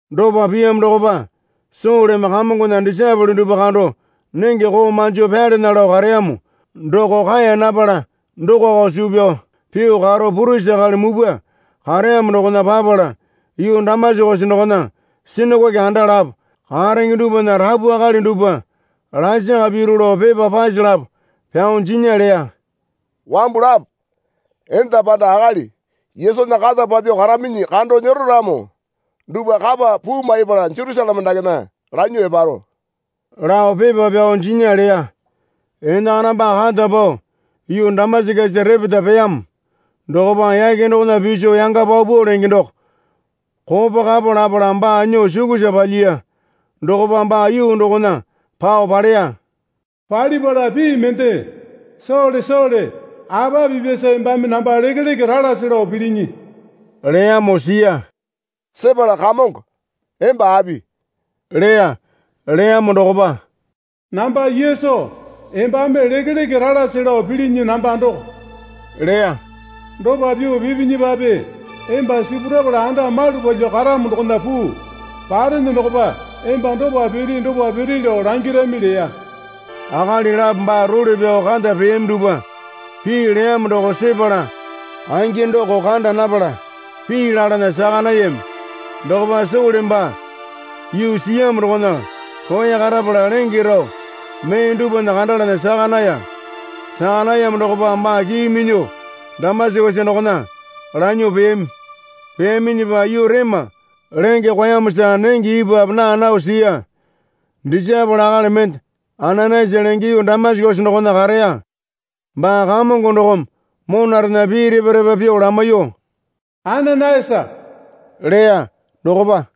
Dopa piyamo dokopa Soleme Kamongona disaepole dupwa kando nenge koo manjo pyalana lao kareyamo doko kaeya napala dokoko suu pyao pyuo karo purisi akali mupwa kareyamo dokona papala yuu Damasakesa dokona sinakoke anda lapo karenge dupwana rapu akali dupwa lasaka piru lao pepa pase lapo pyao jinya leya. Wambu lapo, enda panda akali Yesunya kata papyuo kararaminyi kando nyero ramo dupwa kapa puu maipala Jerusaleme dakena lanyuo eparo, lao pepa pyao jinya leya. Enakana baa kata pao yuu Damasakesa repeta peyamo dokopa yake dokona piso yanga paupau lenge doko kopo kapo lapala baa nyuo sukusa palyiya. Dokopa baa yuu dokona pao paleya. Palipala pii mende, Sole Sole apa pipyasa embame namba lekeleke ralasi lao pilinyi? leyamo siya. Sepala Kamongo, emba api? leya. Leyamo dokopa, Namba Yesu embame lekeleke ralasi lao pilinyi namba doko, leya. Dopa pyuo pipinyipape emba sipurapala anda malu palyuo karamo dokona puu. Parene dokopa emba dopa piri dopa piri lao langirami leya. Akali lapo baa role pyao kata peyami dupwa pii leyamo doko sepala angi doko kanda napala pii lalana saka nayami. Dokopa Sole baa yuu siyamo dokona roya karapala lenge rao mee dupwana kandalana saka naya. Saka nayamo dokopa baa kii minyuo Damasakesa dokona lanyuo peyami. Peyaminyipa yuu rema lenge kwaeyamosa nenge ipwape naa nao siya. Disaepole akali mende Ananayasa lenge yuu Damasakesa dokona kareya. Baa Kamongo dokome monarena pii repa repa pyuo lamaiyuo, Ananayasa leya. Dokopa,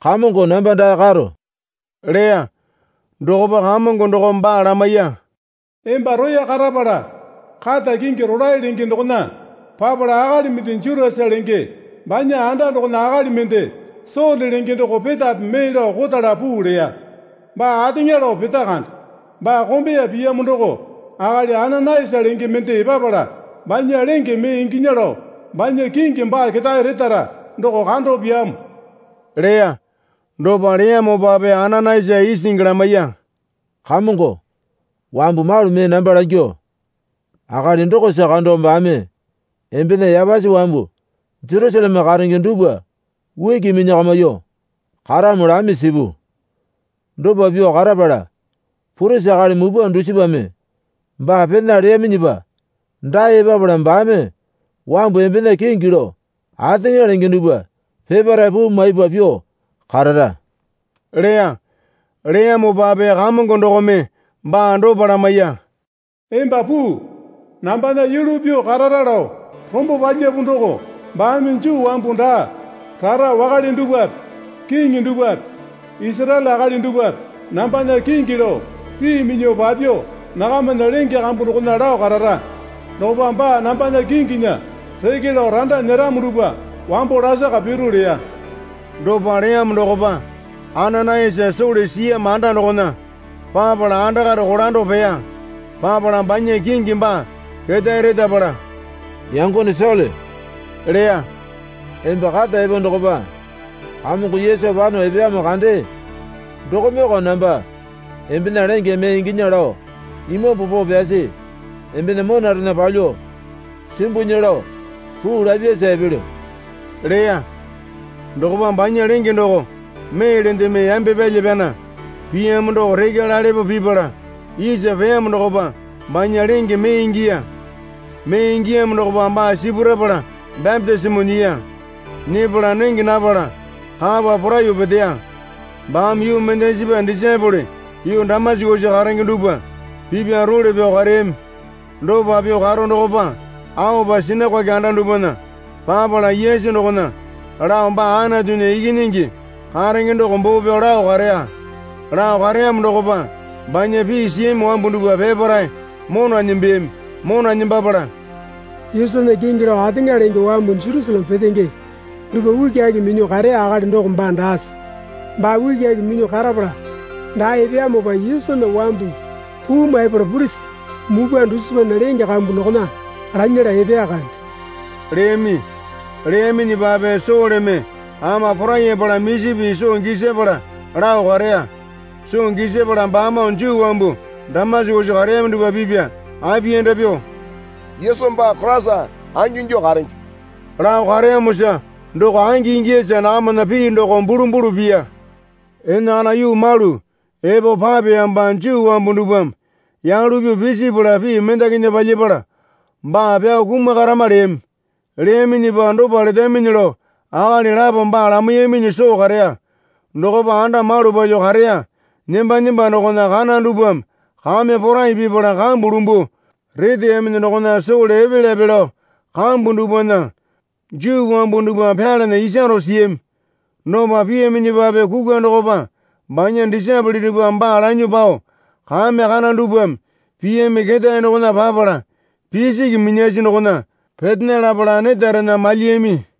Kamongo namba dae karo leya. Dokopa Kamongo dokome baa lamaiya. Emba roya karapala kata kingi rolae lenge dokona papala akali mende Jutasa lenge banya anda dokona akali mende Sole lenge doko petape mee lao kotala puu leya. Baa ateŋa lao peta kande. Baa kombeya piyamo doko akali Ananayasa lenge mende epapala banya lenge mee inginya lao banya kingi baa ketae retara doko kando pyaamo, leya. Dopa leyamopape Ananayasa isingi lamaiya. Kamongo, wambu malu mee namba langyuo akali dokosa kando baame embena yapasi wambu Jerusaleme karenge dupwa uki minyakamyuo karamo lami sipu. Dopa pyuo karapala purisi akali mupwa dusipame baa pena leyaminyipa dae epapala baame wambu embena kingi lao ateŋa lenge dupwa peparae puu maipa pyuo karara leya. Leyamopape Kamongo dokome baa dopa lamaiya. Emba puu. Nambana yulu pyuo karara lao rombo palyapu doko baame Juu wambu daa rara wakale dupwape kiŋi dupwape Isaraele akali dupwape nambana kingi lao pii minyuo papyuo nakamana lenge kambu dokona lao karara. Dokopa baa nambana kinginya reke lao randa nyeramo dupwa wambo lasaka piru leya. Dopa leyamo dokopa Ananayasa Sole siyamo anda dokona papala andakare kolando peya. Papala banya kingi baa ketae retapala, Yangone Sole leya. Emba kata epo dokopa Kamongo Yesu pano epeyamo kandee dokomeyoko namba embena lenge mee inginya lao Imambu Poo Pyasi embena monarena palyuo simbunya lao puu lapyasa epelyo leya. Dokopa banya lenge doko meelendeme yambe pyalya pyana piyamo doko rekya lalepo pipala isa peyamo dokopa banya lenge mee ingiya. Mee ingiyamo dokopa baa sipurapala bapitisimo nyiya. Nyepala nenge napala kapa poraiyuo peteya. Baame yuu mendasipa disaepole yuu Damasakesa karenge dupwa pipya role pyao kareyami. Dopa pyuo karo dokopa aopa sinakoke anda dupwana papala Yesu dokona lao baa Anatunya Ikinyingi karenge doko boo pyao lao kareya. Lao kareyamo dokopa banya pii siyami wambu dupwa peparae mona nembeyami. Mona nembapala, Yesunya kingi lao ateŋa lenge wambu Jerusaleme petenge dupwa ukiaki minyuo kareya akali doko baa daase? Baa ukiaki minyuo karapala dae epeyamopa Yesunya wambu puu maipala purisi mupwa dusipana lenge kambu dokona lanyala epeya kande leyami. Leyaminyipape Soleme ama porayapala misi pii soo gisapala lao kareya. Soo gisapala baamoo Juu wambu Damasakesa kareyami dupwa pipya apiyanda pyuo, Yesu baa Koraisa angingyuo karenge, lao kareyamosa doko angi ingiyasa nakamana pii doko bulumbulu piya. Enakana yuu malu epo papeyamopa Juu wambu dupwame yalu pyuo pisipala pii mendakinya palyapala baa pyao kumakarama leyami. Leyaminyipa dopa letaminyi lao akali lapome baa lamaiyaminyi soo kareya. Dokopa anda malu palyuo kareya nemba nemba dokona kana dupwame kame porai pipala kambu lumbuo reteyaminyi dokona Sole epelyape lao kambu dupwana Juu wambu dupwa pyalana isaro siyami. Dopa piyaminyipape kukwa dokopa banya disaepole dupwame baa lanyuo pao kame kana dupwame piyami ketae dokona papala pisiki minyasi dokona petena lapala netarena malyiyami.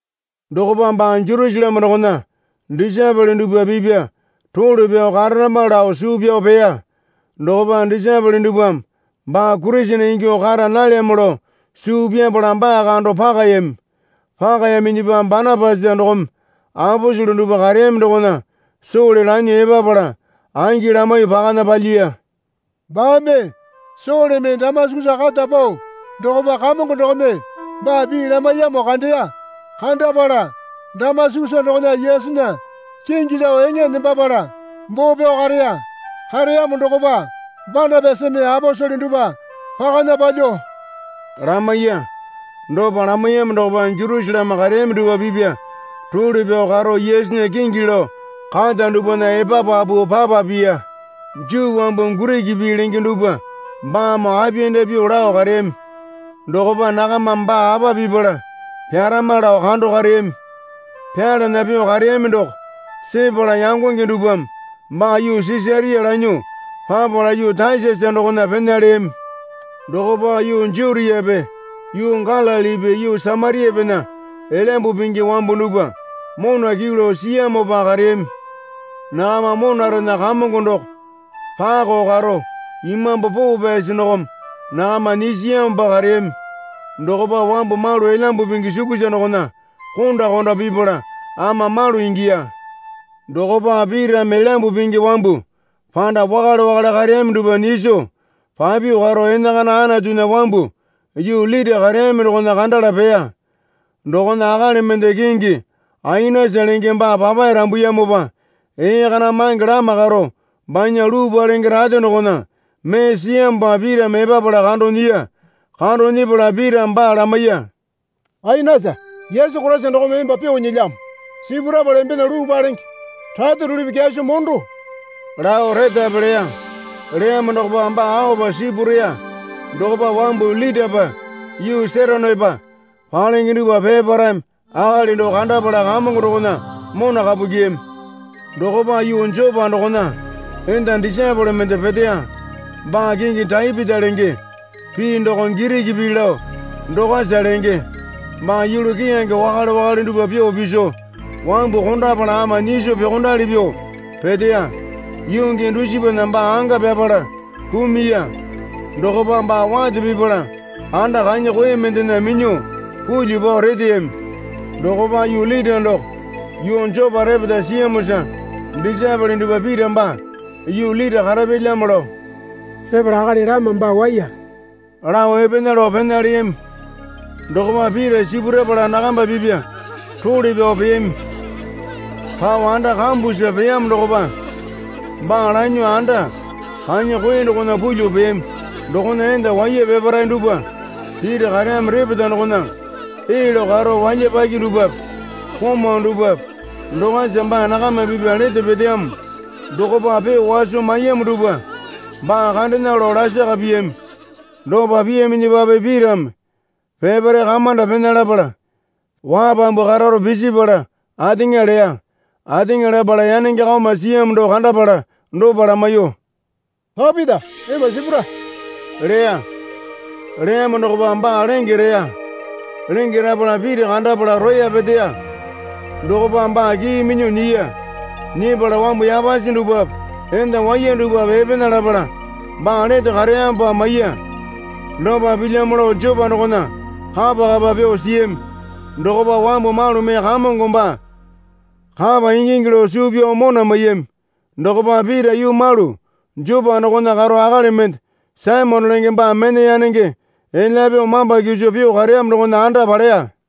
Dokopa baa Jerusaleme dokona disaepole dupwa pipya role pyao kararama lao suu pyao peya. Dokopa disaepole dupwame baa Kurisene ingyuo kara nalyamo lao suu pyapala baa kando pakayami. Pakayaminyipa Banapasa dokome aposele dupwa kareyami dokona Sole lanyuo epapala angi lamaiyuo pakana palyiya. Baame Soleme Damasakesa kata pao dokopa Kamongo dokome baa pii lamaiyamo kandeya. Kandapala Damasakesa dokona Yesunya kingi lao eŋa nembapala boo pyao kareya. Kareyamo dokopa Banapasame aposele dupwa pakana palyuo lamaiya. Dopa lamaiyamo dokopa Jerusaleme kareyami dupwa pipya role pyao karo Yesunya kingi lao kata dupwana epapapu papa piya. Juu wambu Giriki pii lenge dupwa baamoo apiyanda pyuo lao kareyami. Dokopa nakamame baa apa pipala pyarama lao kando kareyami. Pyalana pyuo kareyami doko sepala yangonge dupwame baa yuu Sisaria lanyuo papala yuu Tasasa dokona pena leyami. Dokopa yuu Jutiape yuu Galilipi yuu Samariapena Elyambu Pingi wambu dupwa mona kyuu lao siyamopa kareyami. Nakama monarena Kamongo doko pakao karo Imambu Poo Pyasi dokome nakama nyisiyamopa kareyami. Dokopa wambu malu Elyambu Pingi sukusa dokona konda konda pipala ama malu ingiya. Dokopa Pitame Elyambu Pingi wambu panda wakale wakale kareyami dupwa nyiso papyuo karo enakana Anatunya wambu yuu Lita kareyami dokona kandala peya. Dokona akali mende kingi Ainasa lenge baa papae rambuyamopa ee kana mange lama karo banya luu palenge rate dokona mee siyamopa Pitame epapala kando nyiya. Kando nyepala Pitame baa lamaiya. Ainasa, Yesu Koraisa dokome emba pyuo nyilyamo. Sipurapala embena luu palenge rate rulipi kyaso mondo lao retape leya. Leyamo dokopa baa aopa sipureya. Dokopa wambu yuu Litapa yuu Seronepa palenge dupwa peparaeme akali doko kandapala Kamongo dokona mona kapu kyiyami. Dokopa yuu Jopa dokona enda disaepole mende peteya. Baa kingi Tapita lenge (pii doko Giriki pii lao Dokasa lenge.) Baa yulu keyange wakale wakale dupwa pyuo piso wambu kondapala ama nyiso pyuokondali pyuo peteya. Yuu gii dusipana baa anga pyapala kumuya. Dokopa baa wate pipala anda kanya koe mendena minyuo pulyuo pao reteyami. Dokopa yuu Lita doko yuu Jopa repeta siyamosa disaepole dupwa Pita baa yuu Lita karapyalyamo lao sepala akali lama baa waiya lao epena lao pena leyami. Dokopa Pita sipurapala nakamba pipya role pyao peyami. Pao anda kambusa peyamo dokopa baa lanyuo anda kanya koe dokona pulyuo peyami. Dokona enda waiya peparae dupwa Pita kareyamo repeta dokona ee lao karo walyapaki dupwape komau dupwape Dokasa baa nakama pipya lete peteyamo dokopa pyuo waso maiyamo dupwa baa kandena lao lasaka piyami. Dopa piyaminyipape Pitame peparae kamanda pena lapala wapambu kararo pisipala ateŋa leya. Ateŋa lapala yanenge kaoma siyamo doko kandapala dopa lamaiyuo, Tapita, emba sipura, leya. Leyamo dokopa baa lenge reya. Lenge rapala Pita kandapala roya peteya. Dokopa baa kii minyuo nyiya. Nyepala wambu yapasi dupwape enda waiya dupwape epena lapala baa lete kareyamopa maiya. Dopa pilyamo lao Jopa dokona kapa kapa pyuo siyami. Dokopa wambu malu mee Kamongo baa kapa ingingi lao suu pyao mona maiyami. Dokopa Pita yuu malu Jopa dokona karo akali mende Saimone lenge baa mena yanenge elya pyuo mamba kiso pyuo kareyamo dokona anda paleya.